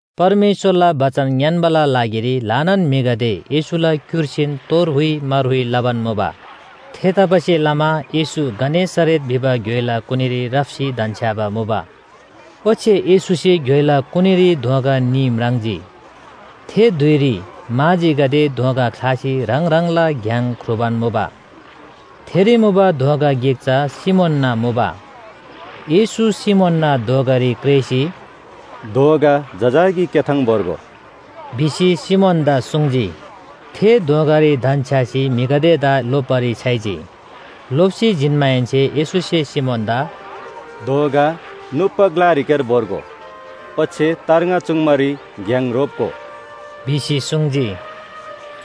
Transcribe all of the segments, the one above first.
परमेश्‍वरला बचन ङ्‌यान्‍बाला लागिरी ल्‍हानान म्‍हिगदे येशूला क्‍युर्सीन तोर हुइ मार हुइ लबान मुबा। थेतबासेलमा येशू गनेसरेत भिबा घ्‍योइला कुनीरी राप्‍सी धन्‍छ्‌याबा मुबा। ओच्‍छे येशूसे घ्‍योइला कुनीरी दोँगा न्‍ही म्राङ्जी। थे धुइरी माझीगदे दोँगा ख्‍लासी ह्राङ ह्राङला घ्‍याङ ख्रुबान मुबा। थेरी मुबा दोँगा गिक चा सिमोनना मुबा। येशू सिमोनना दोँगारी क्रेःसी, “दोँगा जजाकी क्‍याथाङ भोर्गो” भिसी सिमोनदा सुङ्जी। थे दोँगारी धन्‍छ्‌यासी म्‍हिगदेदा लोप्‍बारी छ्‌याइजी। लोप्‍सी जिन्‍माहेन्‍से येशूसे सिमोनदा “दोँगा नुप्‍बा ग्‍लारीक्‍यार भोर्गो, ओच्‍छे तार्ङा चुङ्बारी घ्‍याङ रोप्‍गो” भिसी सुङ्जी।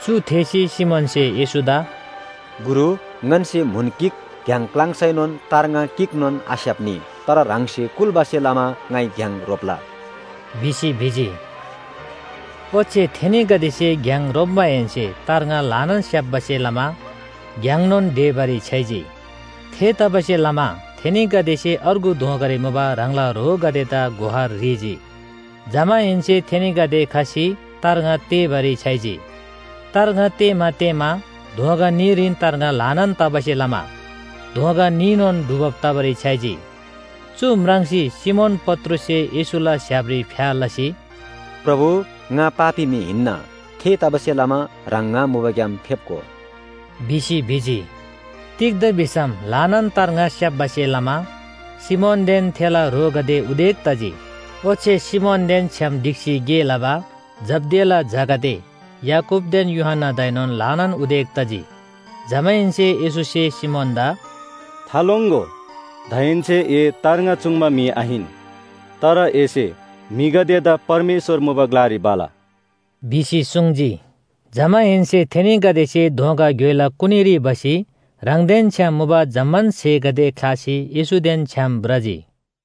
चु थेःसी सिमोनसे येशूदा “गुरु, ङन्‍से म्‍हुन गिक घ्‍याङ क्‍लाङ्सैनोन तार्ङा गिकनोन आस्‍याप्‍नी। तर ह्राङसे कुल्‍बासे लमा ङाइ घ्‍याङ रोप्‍ला” भिसी भिजी। ओच्‍छे थेनीगदेसे घ्‍याङ रोप्‍माहेन्‍से तार्ङा ल्‍हानान स्‍याप्‍बासे लमा घ्‍याङनोन ढेबारी छ्‌याइजी। थेतबासेलमा थेनीगदेसे अर्गु दोँगारी मुबा ह्राङला ह्रोगदेदा गुहार ह्रीजी। जमाहेन्‍से थेनीगदे खसी तार्ङा तेःबारी छ्‌याइजी। तार्ङा तेः‍मा तेः‍मा दोँगा न्‍हीरीन तार्ङा ल्‍हानान तबासे लमा दोँगा न्‍हीनोन डुबब तबारी छ्‌याइजी। चु म्राङ्सी सिमोन पत्रुससे येशूला स्‍य्‍हापरी फ्‍या लसी, “प्रभु, ङा पापी म्‍हि हिन्‍ना। थेतबासेलमा ह्राङ ङा मुबाग्‍याम फेप्‍गो” भिसी भिजी। तिग्‍दा भिसम ल्‍हानान तार्ङा स्‍याप्‍बासे लमा सिमोनदेन थेला ह्रोगदे उदेक तजी। ओच्‍छे सिमोनदेन छ्‌याम ढिक्‍सी गे लबा जब्‍दियाला झागदे याकूबदेन यूहन्‍नादाएनोन ल्‍हानान उदेक तजी। जमाहेन्‍से येशूसे सिमोनदा “थालोङ्‍गो, दाहेन्‍से ए तार्ङा चुङ्बा म्‍हि आहिन, तर एसे म्‍हिगदेदा परमेश्‍वर मुबा ग्‍लारी भला” भिसी सुङ्जी। जमाहेन्‍से थेनीगदेसे दोँगा घ्‍योइला कुनीरी भसी ह्राङदेन छ्‌याम मुबा जम्‍मान स्‍हेगदे ख्‍लासी येशूदेन छ्‌याम भ्रजी।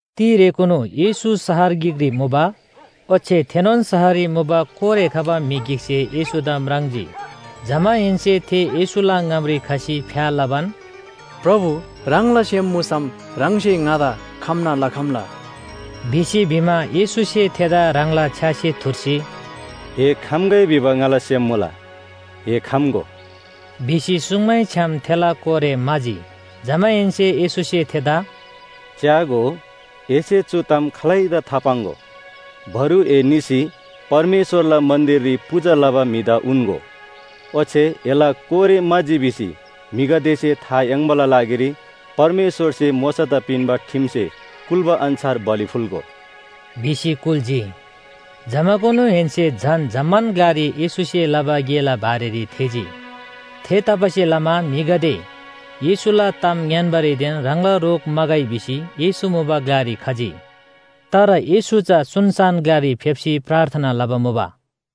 तिरेकुनु येशू शहर गिकरी मुबा। ओच्‍छे थेनोन शहररी मुबा कोरे खबा म्‍हि गिकसे येशूदा म्राङ्जी। जमाहेन्‍से थे येशूला ङामरी खसी फ्‍या लबान, “प्रभु, ह्राङला सेम मुसम ह्राङसे ङादा खम्‍ना लखम्‍ला” भिसी भिमा, येशूसे थेदा ह्राङला छ्‌यासे थुर्सी, “ए खम्‍गै भिबा ङाला सेम मुला, ए खम्‍गो” भिसी सुङ्मैछ्‌याम थेला कोरे म्‍हाजी। जमाहेन्‍से येशूसे थेदा “च्‍यागो, एसे चु ताम खालैदा थापाङ्‍गो! बरु ए निसी परमेश्‍वरला मन्‍दिररी पूजा लबा म्‍हिदा उन्‍गो। ओच्‍छे एला कोरे म्‍हाजी भिसी म्‍हिगदेसे था याङ्बाला लागिरी परमेश्‍वरसे मोशादा पिन्‍बा ठिमसे कुल्‍बा अन्‍छार बलि फुल्‍गो” भिसी कुल्‍जी। जमाकुनुहेन्‍से झन जम्‍मान ग्‍लारी येशूसे लबा गेला बारेरी थेःजी। थेतबासेलमा म्‍हिगदे येशूला ताम ङ्‌यान्‍बारीदेन ह्राङला रोग म्‍हागै भिसी येशू मुबा ग्‍लारी खजी। तर येशू चा सुनसान ग्‍लारी फेप्‍सी प्रार्थना लबा मुबा।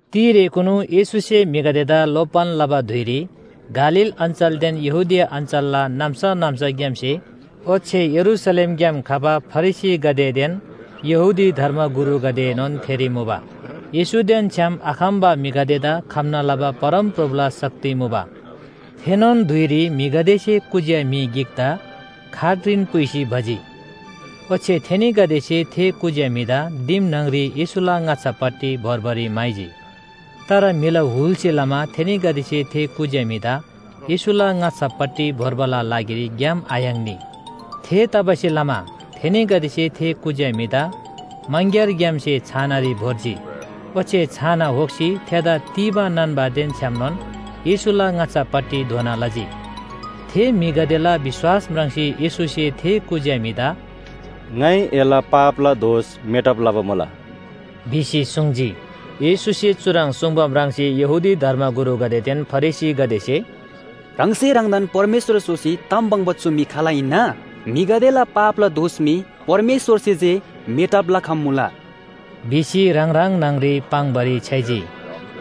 तिरेकुनु येशूसे म्‍हिगदेदा लोप्‍बान लबा धुइरी गालील अञ्‍चलदेन यहूदिया अञ्‍चलला नाम्‍सा नाम्‍साग्‍यामसे ओच्‍छे यरूशलेमग्‍याम खबा फरिसीगदेदेन यहूदी धर्मगुरुगदेएनोन थेरी मुबा। येशूदेन छ्‌याम आखम्‍बा म्‍हिगदेदा खम्‍ना लबा परमप्रभुला शक्ति मुबा। थेनोन धुइरी म्‍हिगदेसे कुज्‍या म्‍हि गिकदा खाटरीन पुइसी भजी। ओच्‍छे थेनीगदेसे थे कुज्‍या म्‍हिदा दिम न्‍हङरी येशूला ङाच्‍छापट्टि भोर्बारी म्‍हाइजी। तर म्‍हिला हुलसे लमा थेनीगदेसे थे कुज्‍या म्‍हिदा येशूला ङाच्‍छापट्टि भोर्बाला लागिरी ग्‍याम आयाङ्नी। थेतबासेलमा थेनीगदेसे थे कुज्‍या म्‍हिदा मङग्‍यारग्‍यामसे छानारी भोर्जी। ओच्‍छे छाना होक्‍सी थेदा तीबा नान्‍बादेन छ्‌यामनोन येशूला ङाच्‍छापट्टि धोना लजी। थे म्‍हिगदेला विश्‍वास म्राङ्सी येशूसे थे कुज्‍या म्‍हिदा “ङाइ एला पापला दोष मेटब लबा मुला” भिसी सुङ्जी। येशूसे चुह्रङ् सुङ्बा म्राङ्सी यहूदी धर्मगुरुगदेदेन फरिसीगदेसे “ह्राङसे ह्राङदान परमेश्‍वर स्‍होसी ताम लबा चु म्‍हि खाल हिन्‍ना? म्‍हिगदेला पापला दोष मी परमेश्‍वरसे जे मेटब लखम्‍मुला” भिसी ह्राङ ह्राङ न्‍हङरी पाङ्‌बारी छ्‌याइजी।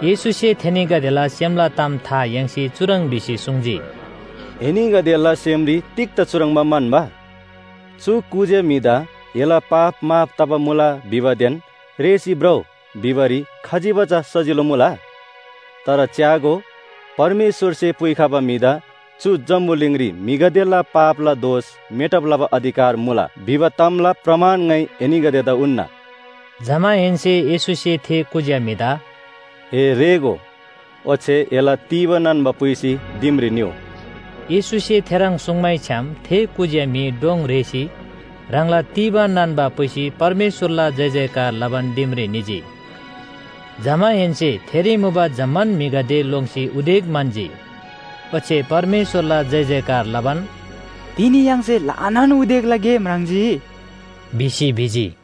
येशूसे थेनीगदेला सेमला ताम था याङ्सी चुह्रङ् भिसी सुङ्जी, “एनीगदेला सेमरी तिग्‍दा चुह्रङ्बा म्‍हन्‍बा? चु कुज्‍या म्‍हिदा ‘एला पाप माफ तबा मुला’ भिबादेन ‘रेःसी भ्रउ’ भिबारी खजिबा चा सजिलो मुला? तर च्‍यागो, परमेश्‍वरसे पुइखबा म्‍हिदा चु जम्‍बुलिङरी म्‍हिगदेला पापला दोष मेटब लबा अधिकार मुला भिबा तामला प्रमाण ङाइ एनीगदेदा उन्‍ना।” जमाहेन्‍से येशूसे थे कुज्‍या म्‍हिदा “ए रेःगो, ओच्‍छे एला तीबा नान्‍बा पुइसी दिमरी निउ।” येशूसे थेह्रङ् सुङ्मैछ्‌याम थे कुज्‍या म्‍हि डोङ रेःसी ह्राङला तीबा नान्‍बा पुइसी परमेश्‍वरला जयजयकार लबान दिमरी निजी। जमाहेन्‍से थेरी मुबा जम्‍मान म्‍हिगदे लोङ्सी उदेक म्‍हन्‍जी। ओच्‍छे परमेश्‍वरला जयजयकार लबान, “तिनी य्‍हाङसे ल्‍हानान उदेकला गे म्राङ्जी” भिसी भिजी।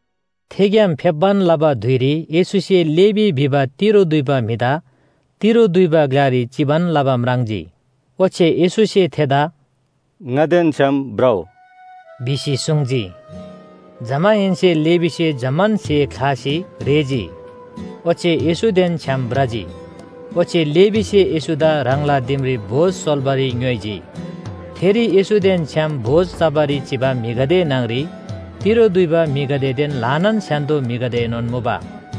थेग्‍याम फेप्‍बान लबा धुइरी येशूसे लेवी भिबा तिरो दुइबा म्‍हिदा तिरो दुइबा ग्‍लारी चिबान लबा म्राङ्जी। ओच्‍छे येशूसे थेदा “ङादेन छ्‌याम भ्रउ” भिसी सुङ्जी। जमाहेन्‍से लेवीसे जम्‍मान स्‍हे ख्‍लासी रेःजी ओच्‍छे येशूदेन छ्‌याम भ्रजी। ओच्‍छे लेवीसे येशूदा ह्राङला दिमरी भोज सोल्‍बारी ङ्‌योइजी। थेरी येशूदेन छ्‌याम भोज चबारी चिबा म्‍हिगदे न्‍हङरी तिरो दुइबा म्‍हिगदेदेन ल्‍हानान स्‍य्‍हान्‍दो म्‍हिगदेएनोन मुबा।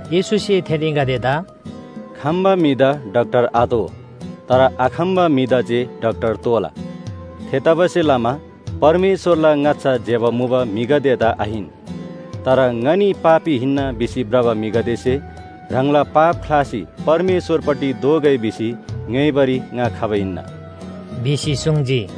येशूसे थेनीगदेदा “खम्‍बा म्‍हिदा डाक्‍टर आतोः, तर आखम्‍बा म्‍हिदा जे डाक्‍टर तोःला! थेतबासेलमा परमेश्‍वरला ङाच्‍छा ज्‍यबा मुबा म्‍हिगदेदा आहिन, तर ङनी पापी हिन्‍ना भिसी भ्रबा म्‍हिगदेसे ह्राङला पाप ख्‍लासी परमेश्‍वरपट्टि दोःगै भिसी ङ्‌योइबारी ङा खबा हिन्‍ना” भिसी सुङ्जी।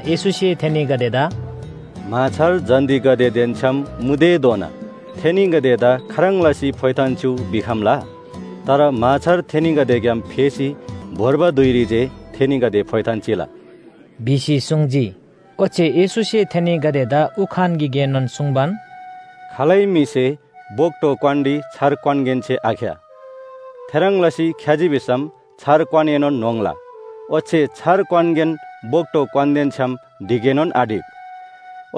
येशूसे थेनीगदेदा “म्‍हाछार जन्‍तीगदेदेन छ्‌याम मुतेधोना थेनीगदेदा खाह्रङ् लसी फोइथान चिउ भिखम्‍ला? तर म्‍हाछार थेनीगदेग्‍याम फेसी भोर्बा धुइरी जे थेनीगदे फोइथान चिला” भिसी सुङ्जी। ओच्‍छे येशूसे थेनीगदेदा उखान गिकएनोन सुङ्बान, “खालै म्‍हिसे बोक्‍टो क्‍वानरी छार क्‍वानगेन्‍से आख्‍या। थेह्रङ् लसी ख्‍याजी भिसम छार क्‍वानएनोन न्‍होङ्ला ओच्‍छे छार क्‍वानगेन बोक्‍टो क्‍वानदेन छ्‌याम ढिकएनोन आढिक।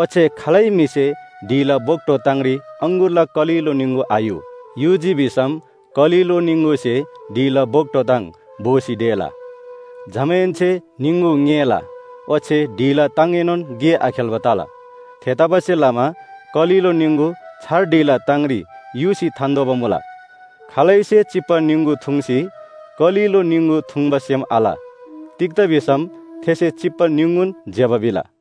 ओच्‍छे खालै म्‍हिसे ढिला बोक्‍टो ताङरी अङगुरला कलिलो निङगु आयु, युजी भिसम कलिलो निङगुसे ढिला बोक्‍टो ताङ भोसी ढेला। जमाहेन्‍से निङगु ङेला ओच्‍छे ढिला ताङएनोन गे आखेल्‍बा तला। थेतबासेलमा कलिलो निङगु छार ढिला ताङरी युसी थान्‍तोःबा मुला। खालैसे चिप्‍बा निङगु थुङ्सी कलिलो निङगु थुङ्बा सेम आल, तिग्‍दा भिसम थेसे चिप्‍बा निङगुन ज्‍यबा भिला।”